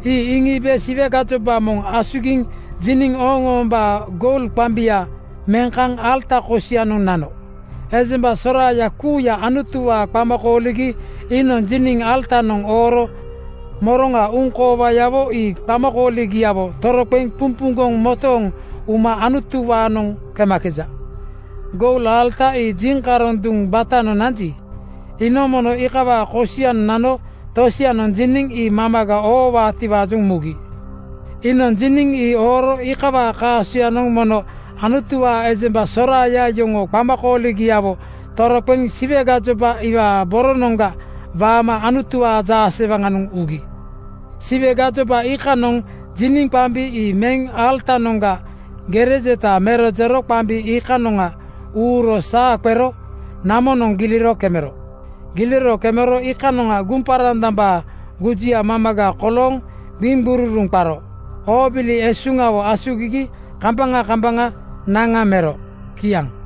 Ii iŋiibe Siwe gajoba moŋ asugiŋ jiniŋ ooŋ-oombaa goul qambia meŋ kaŋ alata kosianoŋ nano. Ejemba soraaya kuuya Anutuwaa qama kooligi iinoŋ jiniŋ alatanoŋ ooro moroŋa uŋkoowayawo ii qamakooligiawo toroqeŋ pumpuŋgoŋ motooŋ uma Anutuwaanoŋ kemakeja. Goul alata ii jiŋkaroŋ duŋ batanoŋ nanji, iinoŋ mono iikawaa kosianoŋ nano tosianoŋ jiniŋ ii mamaga oowaatiwaajoŋ mugi. Iinoŋ jiniŋ ii ooro iikawaa kaasoyanoŋ mono Anutuwaa ejemba soraaya yoŋoo qamakooligiawo toroqeŋ Siwe gajoba iwaa boronoŋga waama Anutuwaa jaasewaŋanoŋ ugi. Siwe gajoba iikanoŋ jiniŋ qambi ii meŋ alatanoŋga gere jeta mero jero qambi iikanoŋ uuro saa qero namonoŋ giliro kemero. Giliro kemero iikanoŋa guŋparandambaa gujuya mamaga kolooŋ gbiŋgururuŋ qaro. Oobili esuŋgiawo asugigi kambaŋa kambaŋa naŋa mero. Kiaŋ.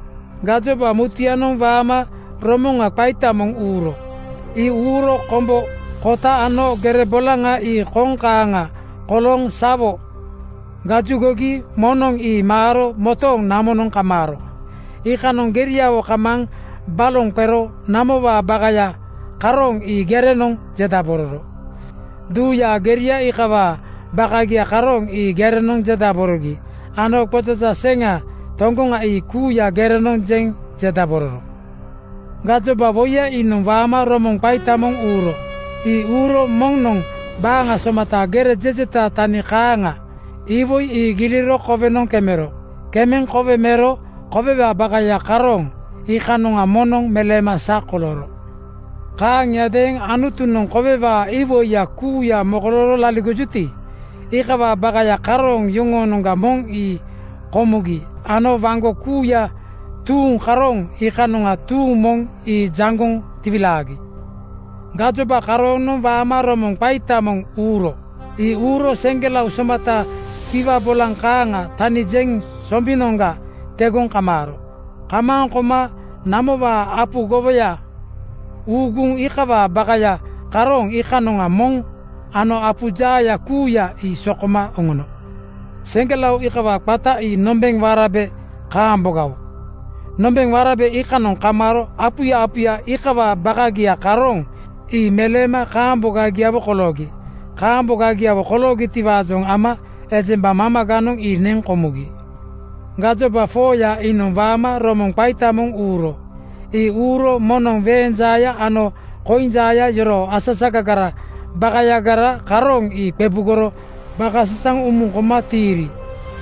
Gajoba mutuyanoŋ waama romoŋa qaita moŋ uuro. Ii uuro kombo (ais) kota ano gere bolaŋa ii koŋ kaaŋa kolooŋ sawo gajugogi moŋnoŋ ii maaro motooŋ namonoŋ kamaaro. Iikanoŋ geriawo kamaaŋ balonoŋ qero namowaa bakaya karooŋ ii gerenoŋ jedabororo. Duuyaa geria iikawaa bakagia karooŋ ii gerenoŋ jedaborogi ano gbojoja seŋa toŋgoŋa ii kuuya gerenoŋ jeŋ jedabororo. Gajoba woiya iinoŋ waama romoŋa qaita moŋ uuro. Ii uuro moŋnoŋ baaŋa somata gere jejeta tani kaaŋa (wolkeino) iwoi ii giliro kowenoŋ kemero. Kemeŋ kowe mero kowewaa bakaya karooŋ iikanoŋga moŋnoŋ meleema sa kolooro. Kaaŋiadeeŋ Anutunoŋ kowewaa iwoiya kuuya mokolooro laligojuti, iikawaa bakaya karooŋ yoŋoonoŋga moŋ ii komugi ano waŋgo kuuya tuuŋ karooŋ iikanoŋga tuuŋ moŋ ii jaŋgoŋ tiwilaagi. Gajoba karooŋanoŋ waama romoŋa qaita moŋ (biugel) uuro. Ii uuro seŋgelao somata kiwa bolaŋ kaaŋa tani jeŋ sombinoŋga tegoŋ kamaaro. Kamaaŋ koma namowaa apu gowoya uŋuŋ iikawaa bakaya karooŋ iikanoŋa moŋ ano apu jaaya kuuya ii sokoma oŋono. Seŋgelao iikawaa qata ii nombeŋ warabe kaambogawo. Nombeŋ warabe iikanoŋ kamaaro apuya apuya iikawaa bakagia karooŋ ii meleema kaambogagiawo koloogi. Kaambogagiawo koloogitiwaajoŋ ama ejemba mamaganoŋ ii neŋ komugi. Gajoba 4:ya iinoŋ waama romoŋa qaita moŋ uuro. Ii uuro moŋnoŋ weeŋ jaaya ano koiŋ jaaya yoroo asasagaraa bakagara karooŋ ii qebugoro bakasasaŋ umuŋ koma tiiri.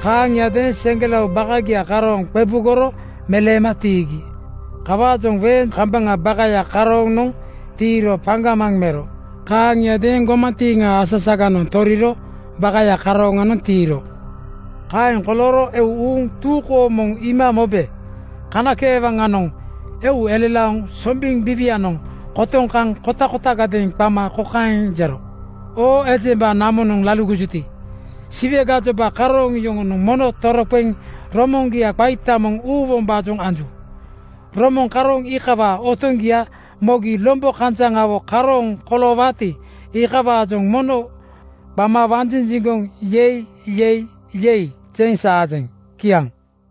Kaaŋiadeeŋ seŋgelao bakagia karooŋ qebugoro meleema tiigi. Kawaajoŋ weeŋ kambaŋaa bakaya karooŋanoŋ tiiro paŋgamaŋ mero. Kaaŋiadeeŋ gomantiiŋaa asasaganoŋ toriro bakaya karooŋanoŋ tiiro. Kaeŋ kolooro eu uuŋ tuu kooŋ moŋ iima mobe kanakeewaŋanoŋ eu elelaoŋ sombiŋ biiwianoŋ kotoŋ kaŋ kotakotagadeeŋ qama kokaeŋ jero, “Oo ejemba namonoŋ laligojuti, Siwe gajoba karooŋ yoŋonoŋ mono toroqeŋ romoŋgia qaita moŋ uuwombaajoŋ anju. Romoŋ karooŋ iikawaa otoŋgia mogi lombo kanjaŋawo karooŋ koloowaati, iikawaajoŋ mono qama wanjinjiŋgoŋ ‘Yei! Yei! Yei!’ jeŋ saajeŋ.” Kiaŋ.